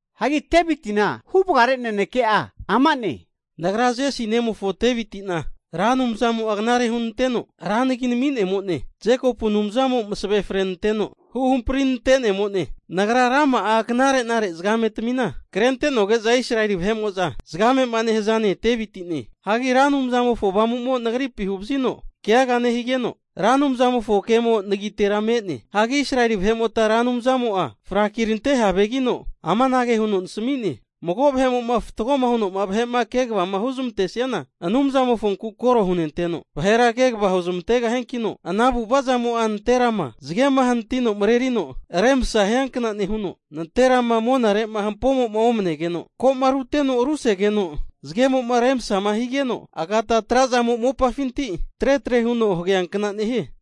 Hagi Deviti'na huvagare naneke'a ama'ne, Nagra Jesi nemofo Devitina Ra Anumzamo'a knare hunanteno ra nagima nami'nemo'ne. Jekopu Anumzamo masave frenanteno huhampri nantenemone. Nagra rama'a knare'nare zagametamina krente'noge'za Israeli vahe'mo'za zagamema nehaza ne' Devitine. Hagi Ra Anumzamofo Avamumo nagripi huvazino keaga nehigeno, Ra Anumzamofo kemo nagitera me'ne. Hagi Israeli vahe'mota Ra Anumzamo'a frakirante havegino, amanage huno nasami'ne, mago vahe'mo'ma fatgoma huno'ma vahe'ma kegava huzmantesiana, Anumzamofonku koro hunenteno, vahera kegava huzmantegahiankino, ana avu'avazamo'a nanterama zage hanatino marerino remsa hiankna nehuno, nanterama monare'ma hampoma omnegeno, ko'ma ruteno rusegeno zagemo'ma remsama higeno, agata tra'zamo'ma mopafinti tretre huno hageankna nehie.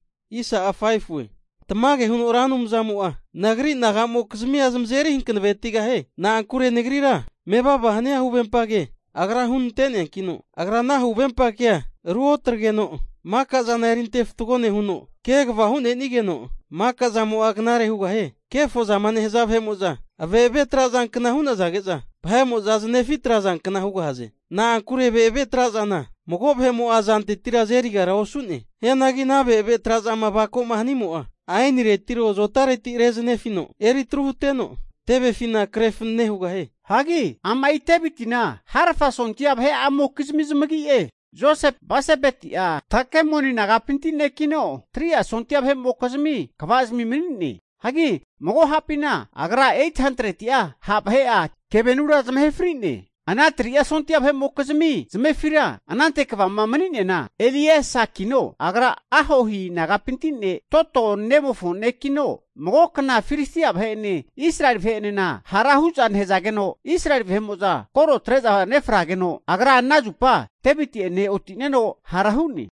Tamage huno Ra Anumzamo'a nagri nagamokizmia zamazeri hanavetigahie. Na'ankure nagrira mevava hania hanave huvempa ke Agra hunanteneankino, agra ana huvempa kea ruotagreno, makazana erinte fatgo nehuno, kegava hu'nenigeno makazamo'a knare hugahie. Hagi kefo zama nehaza vahe'mo'za ave'ave trazankna hu'nazage'za vahe'mo'za zanefi atrazankna hugahaze. Na'ankure ave'ave trazana mago vahe'mo'a azantetira azeriga osu'ne. Hianagi ana ave'ave trazama avako'ma hanimo'a, aeniretiro azotareti rezanefino eri atru huteno, tevefina kre fanane hugahie. Hagi ama'i Devitina harafa sondia vahe'amokizmi zamagi'e, Joseb Basebeti'a Takemoni nagapinti nekino 3'a sondia vahe'mokizmi kvazmi mani'ne. Hagi mago hapina agra 800'a ha' vahe'a kevenura zamahe fri'ne. Ana 3'a sondia vahe'mokizmi zamefira anante kvama mani'neana, Eliesakino, agra Ahohi nagapinti ne' Dodo nemofo nekino, mago kna Filistia vahe'ene Israeli vahe'enena hara hu'za nehazageno, Israeli vahe'mo'za koro atre'za nefrageno, agra ana zupa Deviti'ene oti'neno hara hu'ne.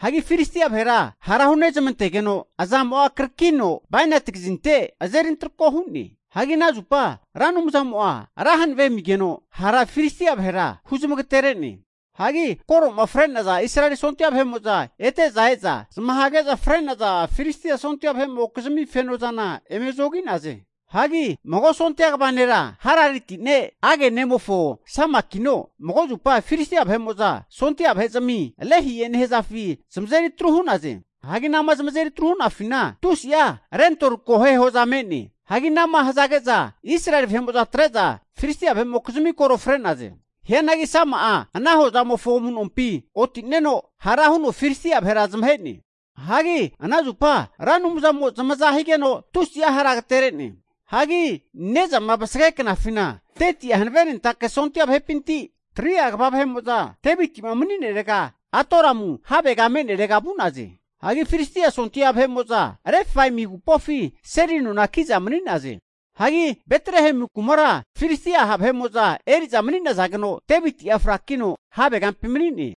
Hagi Filisti'a vahera hara hunezmantegeno azamo'a karakino bainati kazinte azeri antarako hu'ne. Hagi ana zupa Ra Anumzamo'a ra hanave amigeno hara Filistia vahera huzamagatere'ne. Hagi koroma fre'naza Israeli sondia vahe'mo'za ete e'za, zamahege'za fri'naza Filistia sondia vahe'mokizmi fenozana eme zogi'naze. Hagi mago sondia kva nera Harariti ne' Age nemofo Samakino, mago zupa Filistia vahe'mo'za sondia vahezmi Lehie nehazafi zamazeri atru hu'naze. Hagi anama zamazeri atru hu'nafina tusi'a lentoli kohe hoza me'ne. Hagi anama hazage'za Israeli vahe'mo'za atre'za Filistia vahe'mokizmi koro fre'naze. Hianagi Sama'a ana hozamofo amu'nompi oti'neno hara huno Filistia vahera zamahe'ne. Hagi ana zupa Ra Anumzamo zamaza higeno, tusi'a hara agetere'ne. Hagi ne'zama vasage knafina 30'a hanavenentake sondia vahepinti 3'a kva vahe'mo'za Devitima mani'nerega Adulamu havegama me'nerega vu'naze. Hagi Filistia sondia vahe'mo'za Refaimi agupofi seli nona ki'za mani'naze. Hagi Betlehemu kumara Filistia ha vahe'mo'za eriza mani'nazageno, Deviti'a frakino havegampi mani'ne.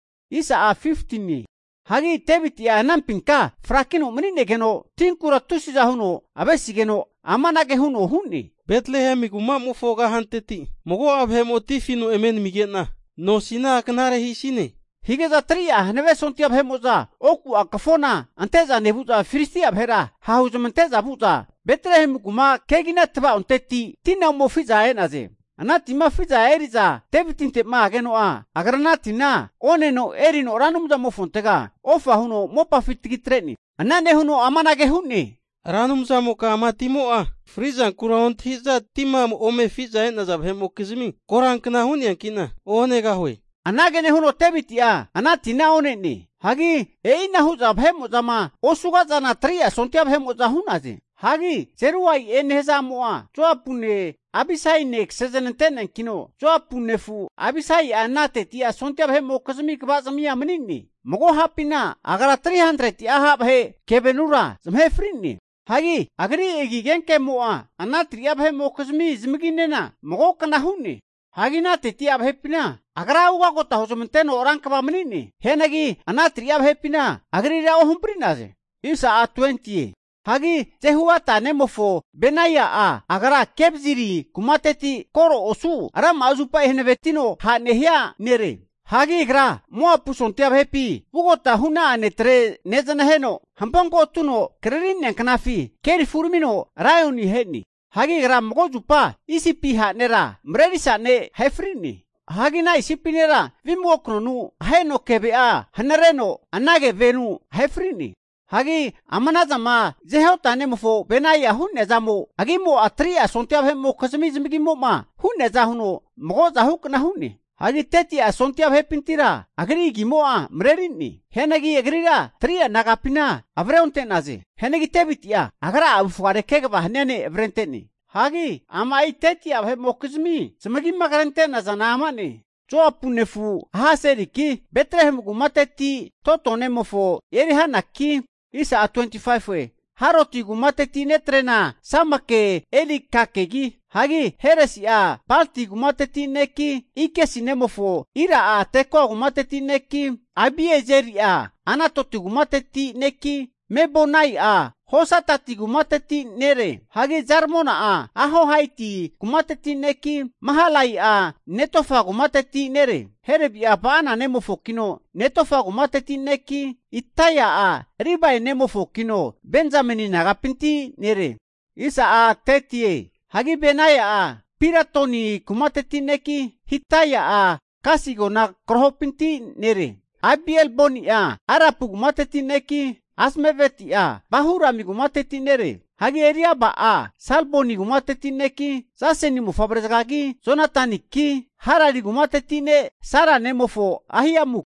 Hagi Deviti'a anampinka frakino mani'negeno tinkura tusiza huno avesigeno amanage huno hu'ne, Betlehemu kuma'mofo kahanteti mago'a vahemo tina afino eme namige'na nosina knare hisine! Hige'za 3'a hanave sondia vahe'mo'za oku'a kafona ante'za nevu'za Filistia vahera ha'huzamante'za vu'za, Betlehemu ku'ma kegina tva'onteti tina ome afi'za e'naze. Ana tima afi'za eri'za Devitinte'ma ageno'a, agra ana tina oneno, erino Ra Anumzamofontega ofa huno mopafi tagitre'ne. Ana nehuno amanage hu'ne, Ra Anumzamoka ama timo'a, frizankura ontahiza tima ome afi'za e'naza vahe'mokizmi korankna hu'neankina onegahue. Anage nehuno Deviti'a ana tina onene. Hagi e'ina hu'za vahe'mo'zama osugazana, 3'a sondia vahe'mo'za hu'naze. Hagi Zeruia'e nehaza a'mo'a Joapune Abisaine kasezanante'neankino, Joapu nefu Abisai ana 30'a sondia vahe'mokizmi kva'zimia mani'ne. Mago ha'pina agra 300'a ha' vahe keve'anura zamahe fri'ne. Hagi agri agi agenkemo'a ana 3'a vahe'mokizmi zamaginena magokna hu'ne. Hagi ana 30'a vahepina agra ugota huzmanteno rankva mani'ne. Hianagi ana 3'a vahepina agrira ohampri'naze. Hagi Jehoiada nemofo Benaia'a agra Kabziri kumateti kore osu rama'a zupa hanavetino ha' nehia nere. Hagi agra Moapu sondia vahepi vugota hu'na'a netre nezanaheno, hampo ko' atuno krari'nea knafi kerifi uramino raioni ahe'ne. Hagi agra mago zupa Isipi ha' nera marerisa ne' ahe fri'ne. Hagi ana Isipi nera vimago knonu aheno keve'a hanareno, ana kevenu ahe fri'ne. Hagi ama'nazana Johoda nemofo Benaia hu'nea zamo agimo'a 3'a sondia vahe'mokizmi zamagimo'ma hu'neaza huno magozahukna hu'ne. Hagi 30'a sondia vahepintira agri agimo'a marerine. Hianagi agrira 3'a nagapina avre onte'naze. Hagi Deviti'a agra'a avufgare kegava hania ne' avrente'ne. Hagi ama'i 30'a vahe'mokizmi zamagima krente'nazana ama'ne, Joapu nefu Asaheliki, Betlehemu kumateti Dodo nemofo, Elhaniki, Harodi kumateti netrena Samake Elikake, hagi Heresi'a Palti kumateti ne'ki, Ikesi nemofo Ira'a Tekoa kumateti neki, Abiezeri'a Anatoti kumateti neki, Mebunaia Husatati kumateti nere. Hagi Zalmoni'a Ahohaiti kumateti neki, Mahalai'a Netofa kumateti nere. Helebi'a Ba'ana nemofokino Netofa kumateti neki, Itaia'a Ribai nemofokino, Benzameni nagapinti nere. Hagi Benaia'a Piratoni kumateti neki, Hidai'a Gasi agona krahopinti nere. Abialboni'a Arapu kumateti neki, Azmaveti'a Bahurimi kumateti nere. Hagi Eliaba'a Salboni kumateti neki, Jaseni mofavrezagagi, Jonataniki, Harari kumateti ne' Sara nemofo Ahiamuki,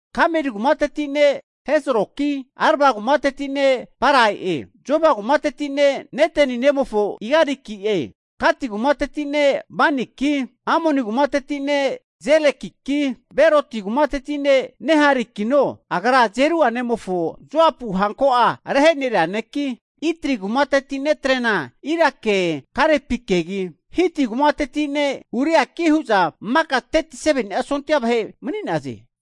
Kameri kumateti ne' Hezroki, Arba kumateti ne' Paraie. Zoba kumateti ne' Natani nemofo'e Igaliki, Gati kumateti ne' Baniki, Amoni kumateti ne' Zelekiki, Beroti kumateti ne' Neharaikino agra Zeruia nemofo Joapu hanko'a reheneria neki, Itri kumateti netrena Irake Garepikegi, Hiti kumateti ne' Uriaki hu'za maka 37ni'a sondia vahe mani'naze.